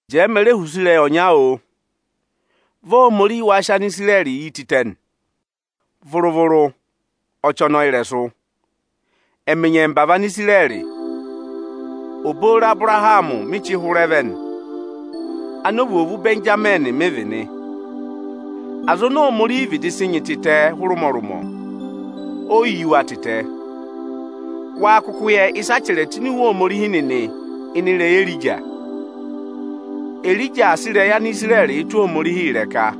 Jẹẹ, me re họ̀ use ịrẹyị ọnya, oo. Vị Ohomorihi wâ sị Anisirẹrị yi tịtẹ nị? Vụrụ-vụrụ, ọchị ọnọọ ịrẹsụ! Ẹmị nyẹmba vị Anisirẹrị. Obooro Abụrahamị mị chị hụrẹ vẹ nị; anovwoovu Ịbẹnjamịnị mị vị nị. Aza oni Ohomorihi vịdị sị nyị tịtẹ hụrẹ ụmọrụmọ, oyi yi wa tịtẹ. Wâ kụkụ yẹ ịsaa chẹrẹ tụ́ ini Iwe Ohomorihi nịnị ịnị ịrẹyị Erija? Erija aa sị ịrẹyị Anisirẹrị tụ́ Ohomorihi ịrẹka.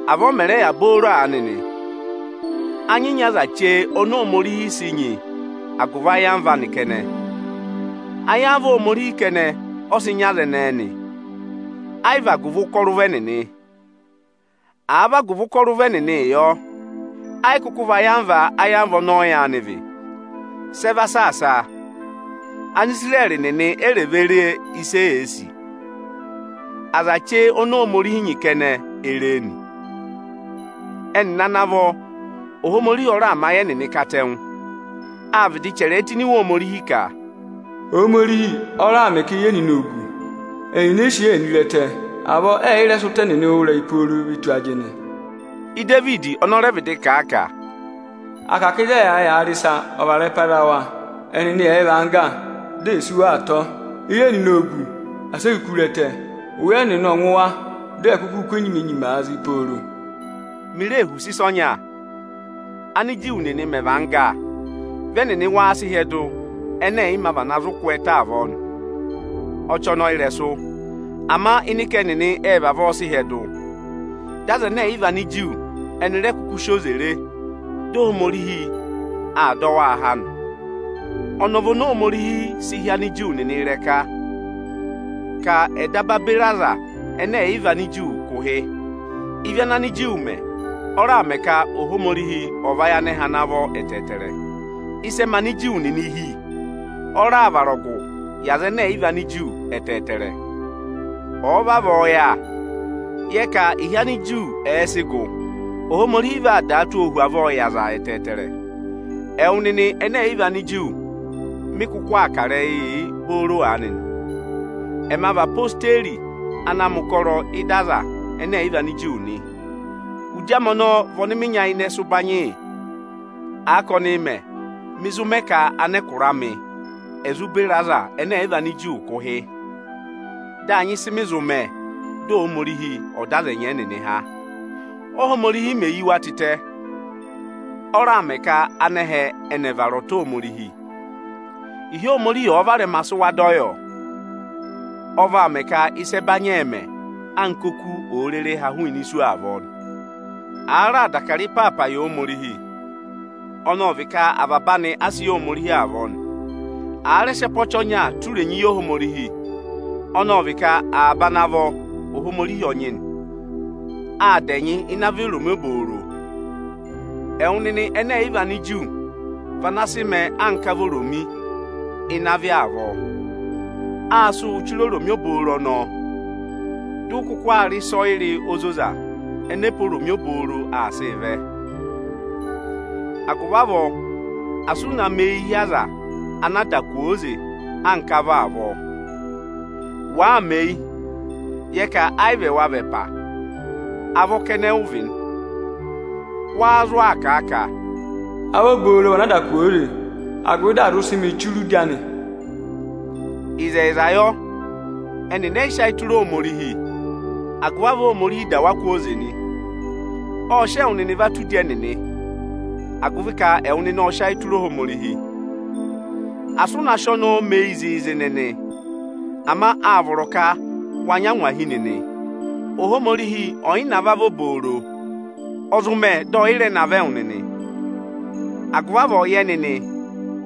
Avọọ ọ mẹ̀ rẹ yà booro aanị nị. A nyị nyị aza chee oni Ohomorihi sị nyị agụvị ayamva anị kẹnẹ. Ayamva Ohomorihi kẹnẹ, ọ sị nyị aza ẹnẹẹ nị, ayị vị agụvị ụkọrọ ụvọ ẹnịnị. Àa vị agụvị ụkọrọ ụvọ ẹnịnịị yọ, ẹ yị kụkụ vị ayamva ọnọọ yaanị vị. Sẹ va saasaa? Anisirẹrị nịnị e rè vee re ịsị eyee sì. Aza chee oni Ohomorihi nyị kẹnẹ e ree nị. Ẹnịnị ana vọ, Ohomorihi ọ raà mẹ ayị ẹnịnị katẹngụ. Â vịdị chẹrẹẹ tụ́ ini Iwe Ohomorihi ka, “Ohomorihi ọ raà mẹ ka eyi ẹnịnị ò gu. Ẹnịnị ẹ yị sị eyi ẹnịnị re ẹtẹ, avọọ ẹyị rẹ sị ụtọ ẹnịnị wụ́ ịrẹyị pooro ve tù ajịnị.” Idevidi ọnị ọ rẹ vịdị kà a ka, “À kà ka ịzị ẹ yà aa rị ịsa, ọ̀ vara ịrẹpa za wa, ẹnịnị ẹ̀ và angga, dị è sí wa atọ! Eyi ẹnịnị ò gu, asị e kuku re ẹtẹ! Ụya ẹnịnị ọ̀ ngụ wa, di è kukuu kú enyima-eyimaa zị pooro!” Mi ree họ̀ use ịsa ọnya. Ániju nịnị mẹ̀ và angga, vị ẹnịnị wâ sị hyẹdụ ẹnẹ ẹ̀ yị mā vana zụ kwẹẹtẹ avọọ nị? Ọchọnọyịrẹsụ! Ama ịnị ka ẹnịnị ệ vavọọ sị hyẹdụ, dị Anigiriki, ẹnị rẹ kụkụ sị oze re, dị Ohomorihi aa dọ waa há nị. Ọnọọ vị oni Ohomorihi sị hị́ Aniju nịnị ịrẹka, ka ẹ̀ daba beri Anigiriki kụ̀ ụhị. Ịvị ana Aniju mẹ, ọ raà mẹ ka Ohomorihi ọ̀ vayị anẹhẹ ana vọ ẹtẹẹtẹrẹ. Ịsẹẹ mẹ Aniju nịnị ịhị, ọ raà vara ọgụ yị Anigiriki ẹtẹẹtẹrẹ. Ọ̀ọ vavọọ yà, yẹ ka ịhị Aniju ẹ̀ẹ sị gụ, Ohomorihi vaa dàa tụ́ ọọ hu avọọ yị aza ẹtẹẹtẹrẹ. Ẹwụ nịnị ẹnẹ ẹ̀yị vị Aniju mị kụkụ aa kà ịrẹyịị yị booro aanị nị. Ẹma vị odeyi ana aa mẹ̀ ụkọrọ ị́da Anigiriki nị. Udi amị ọnọọ vị ọnị mị nyayịnẹ sị ụbanyị yị. Àa ka ọnị mẹ, mị zụ mẹ ka anẹkụra amị è zụ beri Anigiriki kụ̀ ụhị, dị à nyị ịsị mị zụ mẹ, dị Ohomorihi ọ̀ dọ aza ẹnẹ ẹ̀yị vị Aniju kụ̀ ụhị, dị à nyị ịsị mị zụ mẹ, dị Ohomorihi ọ̀ dọ aza ẹnyị ẹnịnị há. Óhomorihi mè yi wa tịtẹ, ọ raà mẹ ka anẹhẹ ẹnị ẹ̀ vara ọta Ohomorihi. Ịhị Ohomorihi ọ̀ọ va varẹma sị wa dọ yọ? Ọ vaa mẹ ka ịsa ẹbanyị ẹ̀ mẹ anka óku òo rere ha hụụnị isu avọọ nị. Àa raà dà Ịbụrẹẹdị ịpaapa yị Ohomorihi, ọnọọ vị ka avaba anị a sị yị Ohomorihi avọọ nị. Àa rẹ sị ẹpa ọchị ọnya tụ́ irenyi yị Ohomorihi, ọnọọ vị ka avaba ana vọ, Ohomorihi ọ nyị nị. Â dà ẹnyị ịnị avọ oromi obooro. Ẹwụ nịnị ẹnẹ ẹ̀ yị vị Aniju vị ana sị mẹẹ anka avọ oromi ịnị avị avọọ. Â sị wụ́ chire oromi obooro ọnọọ. Dụ ụ kụkụ aa rị ịsọyịrị ozoza ẹnẹ ẹpa oromi obooro aa sịị vẹ. Agụvị avọọ asị ụ na mẹ eyi hi aza anaa dà kwooze anka avọ avọọ! Wàaa mẹ eyi, yẹ ka ayị vị ẹwa vị ẹpa, avọ kẹnẹ ụ vị nị. Wa zụ aa kà a ka, “Avọ obooro vị anaa dà kwooze, agụvị dị à zụ sị mị chire udi anị.” Ịzẹyịza yọ. Ẹnịnị ẹ yị sị ayị tụra Ohomorihi, agụvị avọọ Ohomorihi dà wa kwooze nị. Ộ sị ẹwụ nịnị va tụ́ udi ẹnịnị, agụvị ka ẹwụ nịnị ộ sị ayị tụra Ohomorihi. Asị ụ na sị ọnọọ mẹ eyi zịịzị nịnị, ama â vọrọ ka wa nyị angwahi nịnị! Ohomorihi ọ̀ yị navọ avọ obooro, ọ zụ mẹ dị ọyị rẹ navọ ẹwụ nịnị. Agụvị avọọ yẹ nịnị,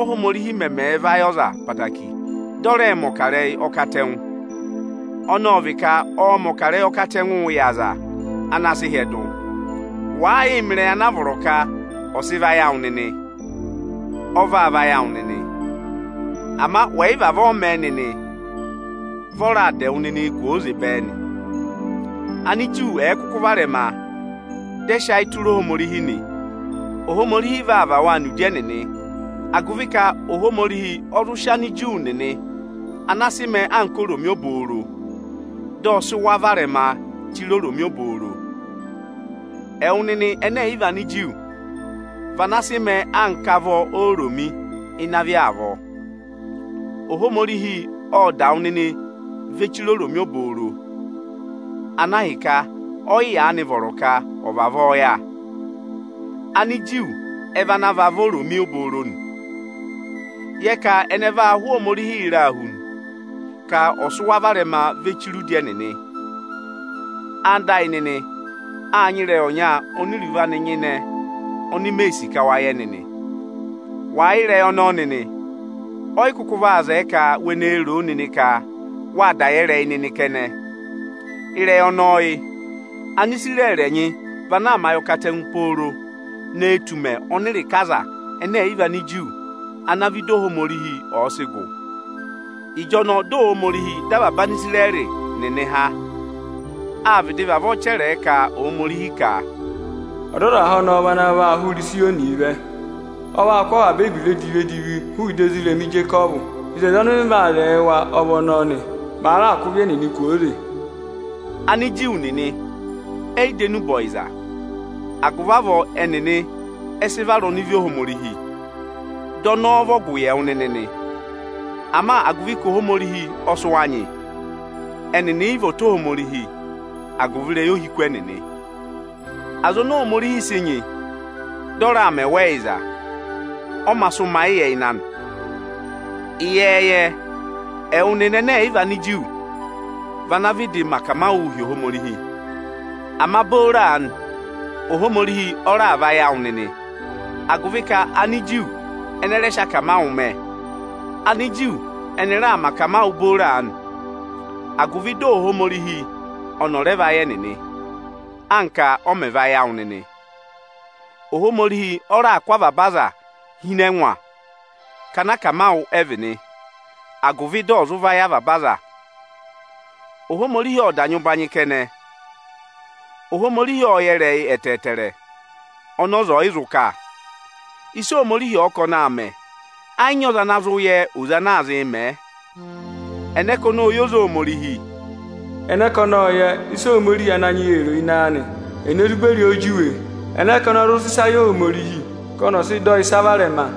Óhomorihi mẹmẹẹ̄ vayị ọza ẹtẹẹtẹrẹ, dị ọ rẹẹ̄ mẹ̀ ọkarẹyị ọkatẹngụ. Ọnọọ vị ka ọọ̄ mẹ̀ ọkarẹyị ọkatẹngụụ yị aza ana sị hyẹdụ. Wàaa yịị mẹ ịrẹyị anaa vọrọ ka ọ̀ sị vayị awụ nịnị, ọ vaa vayị awụ nịnị. Ama wẹ̀ yị vavọọ mẹ nịnị, vị ọ raa dà ẹwụ nịnị kwooze bẹẹ nị. Aniju ẹ̀ẹ kụkụ varẹma, dị ẹyaa sị ayịị tụra Ohomorihi nị, Ohomorihi vaa và waa nọ udi ẹnịnị, agụvị ka Ohomorihi ọ zụ sị (Aniju nịnị ana sị mẹẹ anka oromi obooro, dị ọ sị) wa varẹma chire oromi obooro. Ẹwụ nịnị ẹnẹ ẹ̀yị vị Aniju vị ana sị mẹẹ anka avọ oromi ịnị avị avọọ. Ohomorihi ộ dà wụ nịnị ve chire oromi obooro, ana ahịka ọyị yaanị vọrọ ka ọ̀ vavọọ yà. Aniju ẹ vị ana vị avọ oromi obooro nị. Yẹ ka ẹnị ẹ vaa hụ Ohomorihi ịraa hu nị, ka ọ̀ sị wa varẹma ve chire udi ẹnịnị! Ẹwụ nịnị ẹyịnyara amị, â nyị ịrẹyị ọnya oni iruvo anị nyịnẹ oni mee sì ka wa yẹ nịnị. Wàa yẹ ịrẹyị ọnọọ nịnị, ọyị kụkụ vaa zẹẹ ka we nee roo nịnị ka wâ da yẹ ịrẹyị nịnị kẹnẹ. Ịrẹyị ọnọọ yị: Anisirẹrị ẹnyị vị ana aa mẹ ayọkatẹngụ pooro ne tù ụmẹ ọnị ịrịka Anigiriki ana aa vẹ ịda Ohomorihi ọ̀ọ sị gụ. Ịjọnọọ dị Ohomorihi dọ avaba Anisirẹrị nịnị há. Â vịdị vavọọ chẹrẹẹ (ka Ohomorihi) ka, “Ọdọzaha ọnọọ vị ana vaa hụrẹ Ịzayọnịị vẹ. Ọ vaa kụ́ avaba ebira edivi-edivi hụụ ịda irima ezi Ijekọvụ. Oto ọnị mị vee wo yị wa ọ vị ọnọọ nị, màa raà kụ́ ịvị ẹnịnị kwooze.” Aniju nịnị ẹyị dọ enube ọyịza, agụvị avọọ ẹnịnị ẹ sị vara ọnịvị Ohomorihi, dị ọnọọ vị ọgụ yị ẹwụ nịnị nị. Ama agụvị ka Ohomorihi ọ sị wa nyị, ẹnịnị yị vị ọta Ohomorihi agụvị ịrẹyị ohiku ẹnịnị. Aza oni Ohomorihi sị nyị, dị ọ raà mẹ wa ẹyịza, ọ mā sị ụmayịyẹ ịnị anị. Ịyẹẹyẹ, ẹwụ nịnị ẹnẹ ẹ̀yị vị Aniju vị anaā vịdịị mẹ akamawụụ hi Ohomorihi. Ama booro aanị, Ohomorihi ọ raà vayị awụ nịnị, agụvị ka Aniju ẹnị ẹ rẹ sị akamawụ mẹ. Aniju ẹnị raa mẹ akamawụ booro aanị, agụvị dị Ohomorihi ọnị ọ̀ rẹ vayị ẹnịnị, anka ọ mẹ̀ vayị ẹwụ nịnị. Ohomorihi ọ raà kụ́ avaba aza hi ịnị ẹngwa ka anakamawụ ẹ vị nị, agụvị dị ọ̀ zụ vayị avaba aza. Ohomorihi ộ da nyị ụbanyị kẹnẹ! Ohomorihi ộ yẹ ịrẹyị ẹtẹẹtẹrẹ ọnị ọza ọ̀yị zụ kà. Ịsị Ohomorihi ọ̀ọ ka ọnị aa mẹ, ẹ yị nyị ọza ana zụ yẹ oze ana aa zịị mẹẹ. Ẹnẹ ka ọnị ộ yẹ oze Ohomorihi? “Ẹnẹ ka ọnị ộ yẹ ịsị Ohomorihi Ananyị yị ee ro ịnị ayị anị? Ene zụ beri ọọ juwe? Ẹnẹ ka ọnị ọ zụ sị ịsa yị Ohomorihi ka ọnị ọ̀ sị dọ ọ ịsa varẹma?”